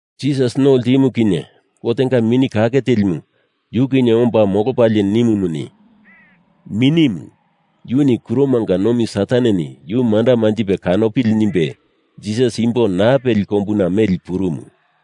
Jisas no ltimu kinye Gotenga Mini Kake Telimu yu kinye omba molopalie nimumuni, Minimu yuni kuromanga nomi Sataneni yu manda manjipe kanopili nimbe Jisas imbo naa peli kombuna meli purumu.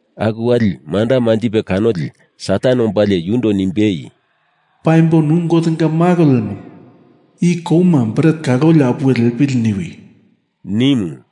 Aku wali manda manjipe kanoli Satan ombalie yundo nimbei, “Paimbo nu Gotenga Malo lemo i kouma bret kaloli apuwe lepili niwi,” nimu.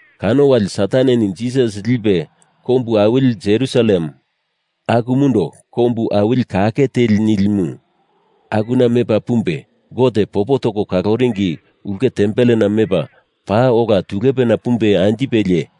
Kano wali Sataneni Jisas lipe kombu awili Jerusalem, akumundo kombu awili kake teli nilimu, akuna mepa pumbe Gote popo toko kaloringi ulke tempelena mepa, paa ola tulepena pumbe anjipelie,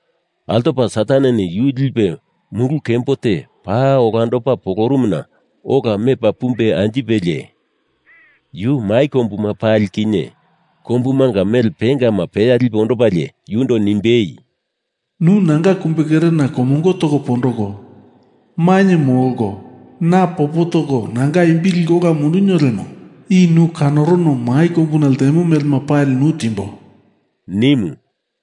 Altopa Sataneni yu lipe mulu kembo te paa olandopa polorumuna ola mepa pumbe anjipelie, yu mai kombuma pali kinye kombumanga mele pengama peya lipe ondopalie yundo nimbei, “Nu nanga kumbekerena komongo toko pondoko mainye molko na popo toko nanga imbi liko ola mundunio lemo i nu kanokono mai kombuna ltemo melema pali nu timbo,” nimu.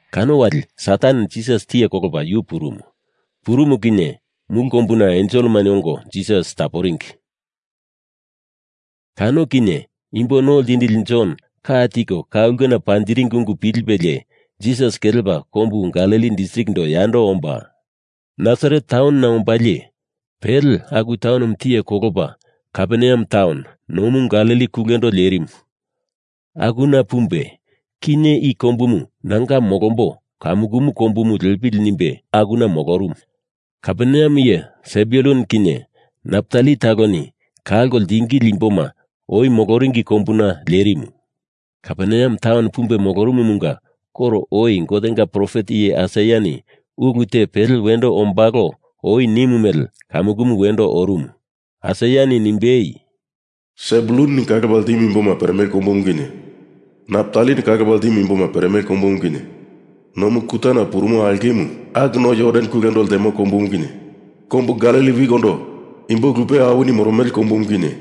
Kano wali Satan Jisas tiye kolopa yu purumu. Purumu kinye mulu kombuna enselema ongo Jisas taporingi. Kano kinye Imbo No Ltindili Jon ka tiko ka ulkena panjiringi ungu pilipelie Jisas kelepa kombu Galili distrikindo yando omba Nasaret taunona ombalie, pele aku taunomu tiye kolopa Kaperneam taun, nomu Galili kulendo lerimu, akuna pumbe kinye i kombumu nanga molombo kamukumu kombumu lepili nimbe akuna molorumu. Kaperneam iye Sebulun kinye Naptali taloni kalko ltingili imboma oi moloringi kombuna lerimu. Kaperneam taunona pumbe molorumumunga koro oi Gotenga profet iye Aisaiani ulu te pele wendo ombalo oi nimu mele kamukumu wendo orumu. Aisaiani nimbei, Sebulunoni kalopa ltimu imboma peremele kombumu kinye, Naptalini kalopa ltimu imboma peremele kombumu kinye, nomu kutana purumo aulkemu aku no Jordan kulendo lemo kombumu kinye, kombu Galili wikondo imbo lupe awini moromele kombumu kinye,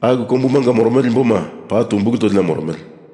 aku kombumanga moromele imboma paa tumbulu tolina moromele.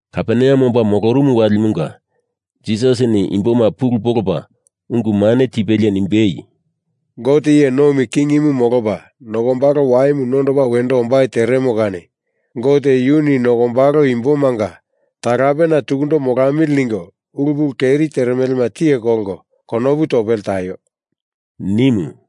Kaperneam omba molorumu walimunga Jisasini imboma pulu polopa unguma nimbe tipelie nimbei, “Gote iye nomi kingimu molopa nokombalo waimu nondopa wendo ombai teremo kani Gote yuni nokombalo imbomanga talapena tukundo molamili ningo ulu pulu keri teremelema tiye kolko konopu topele taio,” nimu.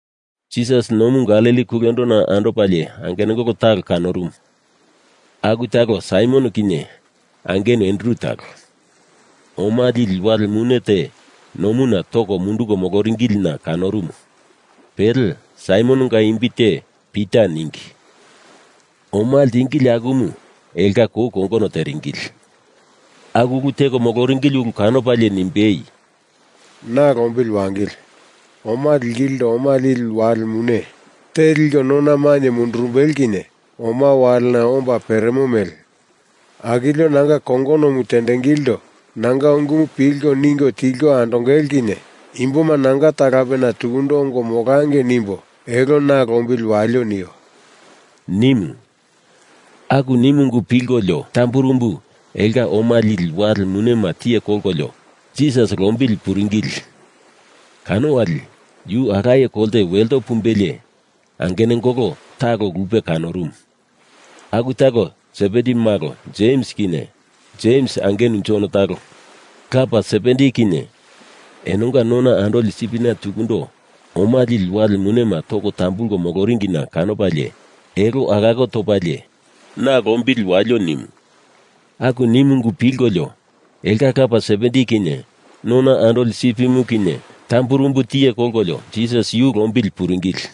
Jisas Nomu Galili kulendona andopalie angenungolo talo kanorumu. Aku talo Saimon kinye angenu Andru talo. Oma lili wale mune te nomuna toko munduko moloringilina kanorumu. Pele Saimononga imbi te Pita ningi. Oma ltingili akumu elonga kou kongono teringili. Aku ulu teko moloringili ulu kanopalie nimbei, “Na lombili wangili. Oma lingilindo oma lili wale mune te liko nona mainye mundurumbele kinye omama walena omba peremo mele, akilio nanga kongonomu tengilindo nanga ungumu pilko ningo tilko andongele kinye imboma nanga talapena tukundo ongo molangei nimbo elo na lombili walio nio,” nimu. Aku nimu ungu pilkololio tamburumbu elonga oma lili wale munema tiye kolkolio Jisas lombili puringili. Kano wali yu alaye kolte welto pumbelie angenungolo talo lupe kanorumu. Aku talo Sebedi malo Jems kinye Jems angenu Jon talo. Lapa Sebedi kinye enonga nona andoli sipina tukundo oma lili wale munema toko tambulko moloringina kanopalie elo alako topalie, na lombili walio nimu. Aku nimu ungu pilkololio elonga lapa Sebedi kinye nona andoli sipimu kinye tamburumbu tiye kolkolio Jisas yu lombili puringili.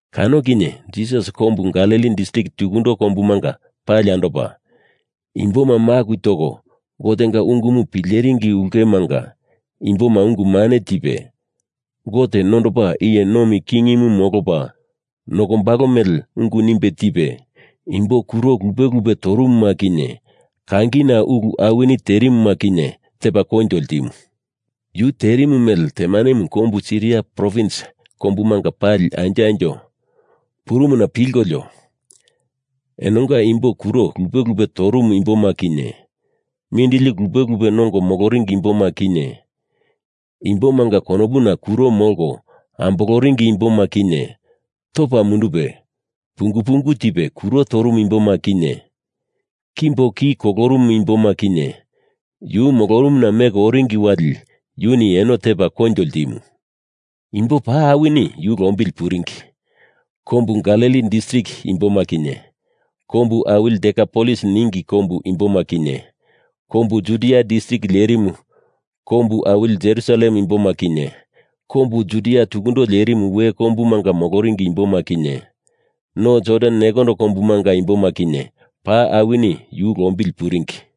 Kano kinye Jisas kombu Galili distrik tukundo kombumanga pali andopa, imboma maku toko Gotenga ungumu pileringi ulkemanga imboma ungu mane tipe, Gote nondopa iye nomi kingimu molopa nokombalo mele ungu nimbe tipe, imbo kuro lupe lupe torumuma kinye kangina ulu awini terimuma kinye tepa koinjo ltimu. Yu terimu mele temanemu kombu Siria provins kombumanga pali anjo anjo purumuna pilkolio enonga imbo kuro lupe lupe torumu imboma kinye, mindili lupe lupe nongo moloringi imboma kinye, imbomanga konopuna kuro molko amboloringi imboma kinye, topa mundupe pungu pungu tipe kuro torumu imboma kinye, kimbo ki kulorumu imboma kinye, yu molorumuna meko oringi wali yuni eno tepa koinjo ltimu. Imbo paa awini yu lombili puringi. Kombu Galili distrik imboma kinye, Kombu Awili Dekapolis ningi kombu imboma kinye, kombu Judia distrik lerimu kombu awili Jerusalem imboma kinye, kombu Judia tukundo lerimu we kombumanga moloringi imboma kinye, no Jordan nekondo kombumanga imboma kinye, paa awini yu lombili puringi.